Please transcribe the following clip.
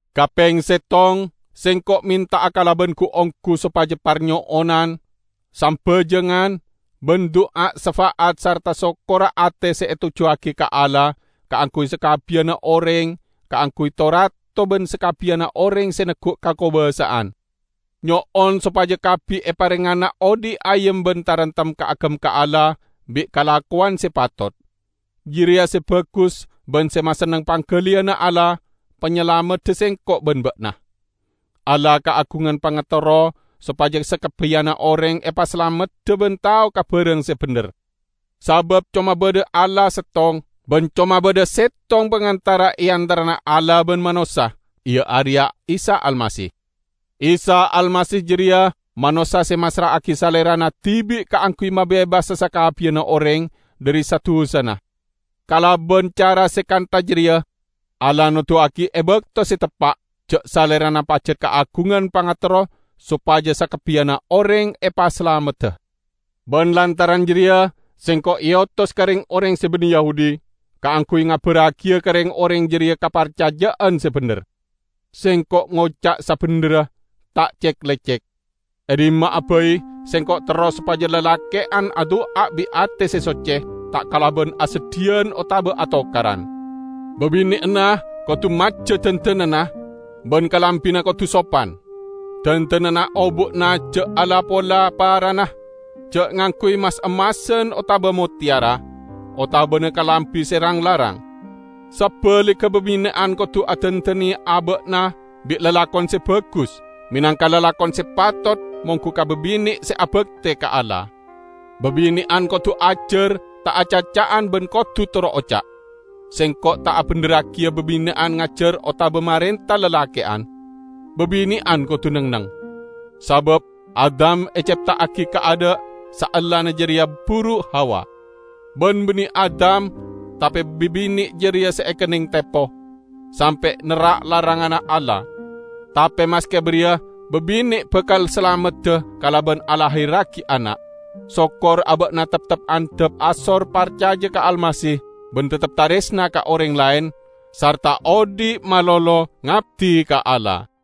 Kapeng settong, sengko' menta'a kalaban gu-onggu sopaja parnyo'onan, sambajangan, ban du'a syafa'at sarta sokkorra ate se etojjuwagi ka Allah kaangguy sakabbiyanna oreng; kaangguy to-rato ban sakabbiyanna oreng se neggu' kakobasa'an. Nyo'on sopaja kabbi eparengngana odhi' ayem ban taremtem kaagem ka Allah bi' kalakowan se patot. Jareya se bagus ban se masenneng panggaliyanna Allah, Panyalamedda sengko' ban ba'na. Allah kaagungan pangaterro sopaja sakabbiyanna oreng epasalamedda ban tao ka barang se bendher. Sabab coma badha Allah settong, ban coma badha settong pangantara e antarana Allah ban manossa, iya areya Isa Almasih. Isa Almasih jareya manossa se massra'agi Salerana dibi' kaangguy mabebasa sakabbiyanna oreng dhari sa-dusana. Kalaban cara se kantha jareya Allah noduwagi e bakto se teppa', ja' Salerana pajat kaagungan pangaterro sopaja sakabbiyanna oreng epasalamedda. Ban lantaran jareya sengko' eotos ka reng-oreng se banne Yahudi, kaangguy ngabarragiya ka reng-oreng jareya kaparcaja'an se bendher. Sengko' ngoca' sabendherra, ta' cek-lecek. E dhimma'a bai, sengko' terro sopaja lalake'an adu'a bi' ate se socce, ta' kalaban aseddhiyan otaba atokaran. Babine'anna kodu majja dandananna, ban kalambina kodu sopan. Dandananna obu'na ja' ala-pola parana, ja' ngangguy mas-emmasan otaba motteyara, otabana kalambi se rang-larang. Sabaligga babine'an kodu adandane aba'na bi' lalakon se bagus, menangka lalakon se patot monggu ka babine' se abakte ka Allah. Babine'an kodu ajar ta' acaca'an ban kodu toro' oca'. Sengko' ta' abendherragiya babine'an ngajar otaba marenta lalake'an; babine'an kodu neng-enneng. Sabab Adam ecepta'agi kaadha', saellana jareya buru Hawa. Ban banne Adam, tape babine' jareya se ekenneng tepo, sampe' nerrak laranganna Allah. Tape maske bariya babine' bakal salamedda kalaban alahirragi ana', sokor aba'na teptep andhap asor parcaja ka Almasih ban teptep taresna ka oreng laen sarta odhi' malolo ngabdi ka Allah.